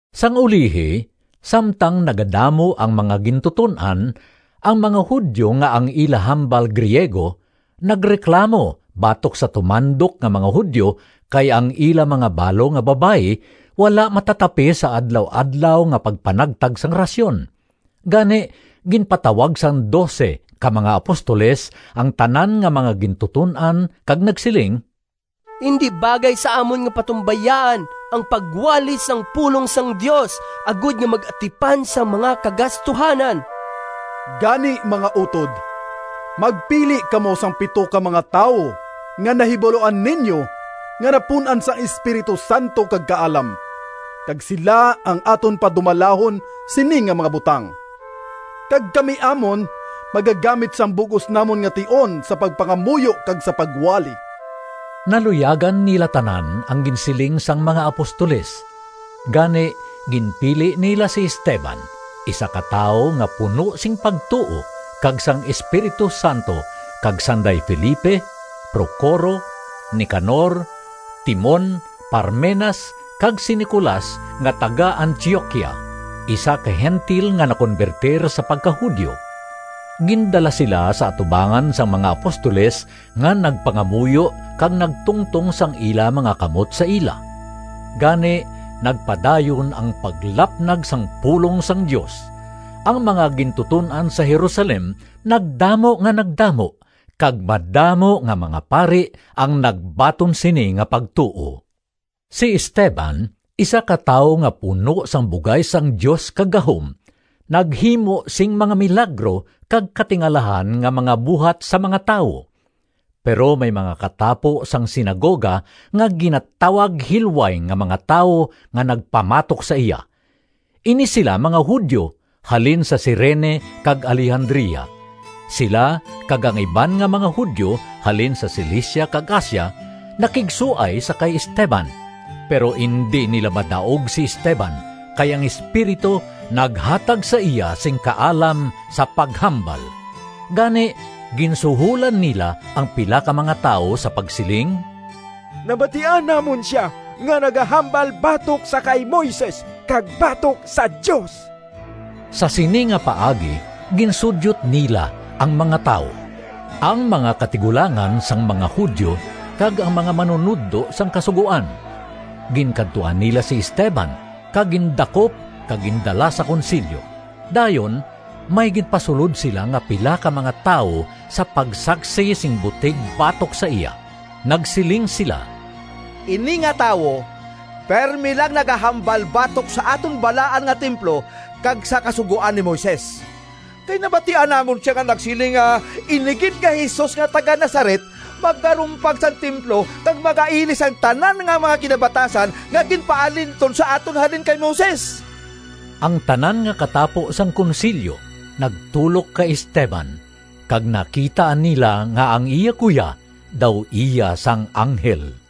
Sang ulihi, samtang nagadamo ang mga gintuton-an, ang mga Judio nga ang ila hambal Griego nagreklamo batok sa tumandok nga mga Judio kay ang ila mga balo nga babayi wala matatapi sa adlaw-adlaw nga pagpanagtag sang rasyon. Gani, ginpatawag sang dose ka mga apostoles ang tanan nga mga gintuton-an kag nagsiling, “Indi bagay sa amon nga patumbayaan ang pagwali sang pulong sang Dios agod nga mag-atipan sang mga kagastuhanan. Gani, mga utod, magpili kamo sang pito ka mga tawo nga nahibaluan ninyo nga napun-an sang Espiritu Santo kag kaalam, kag sila ang aton padumalahon sini nga mga butang. Kag kami amon magagamit sang bug-os namon nga tion sa pagpangamuyo kag sa pagwali.” Naluyagan nila tanan ang ginsiling sang mga apostoles, gani ginpili nila si Esteban, isa ka tawo nga puno sing pagtuo kag sang Espiritu Santo, kag sanday Felipe, Procoro, Nicanor, Timon, Parmenas kag si Nicolas nga taga-Antioquia, isa ka Gentil nga nakonbertir sa pagka-Judio. Gindala sila sa atubangan sang mga apostoles nga nagpangamuyo kag nagtungtong sang ila mga kamot sa ila. Gani nagpadayon ang paglapnag sang pulong sang Dios. Ang mga gintuton-an sa Jerusalem nagdamo nga nagdamo kag madamo nga mga pari ang nagbaton sini nga pagtuo. Si Esteban, isa ka tawo nga puno sang bugay sang Dios kag gahom, naghimo sing mga milagro kag katingalahan nga mga buhat sa mga tawo. Pero may mga katapo sang sinagoga nga ginatawag Hilway nga mga Tawo nga nagpamatok sa iya. Ini sila mga Judio halin sa Cirene kag Alejandria. Sila kag ang iban nga mga Judio halin sa Cilicia kag Asia nakigsuay sa kay Esteban. Pero indi nila madaog si Esteban kay ang Espiritu naghatag sa iya sing kaalam sa paghambal. Gani ginsuholan nila ang pila ka mga tawo sa pagsiling, “Nabatian namon sia nga nagahambal batok sa kay Moises kag batok sa Dios!” Sa sini nga paagi ginsudyot nila ang mga tawo, ang mga katigulangan sang mga Judio kag ang mga manunodlo sang Kasugoan. Ginkadtuan nila si Esteban kag gindakop kag gindala sa Konsilyo. Dayon may ginpasulod sila nga pila ka mga tawo sa pagsaksi sing butig batok sa iya. Nagsiling sila, “Ini nga tawo pirme lang nagahambal batok sa aton balaan nga templo kag sa Kasugoan ni Moises. Kay nabatian namon sia nga nagsiling nga ini gid nga Jesus nga taga-Nazaret magarumpag sang templo kag maga-ilis sang tanan nga mga kinabatasan nga ginpaalinton sa aton halin kay Moises!” Ang tanan nga katapo sang Konsilyo nagtulok kay Esteban kag nakita nila nga ang iya guya daw iya sang anghel.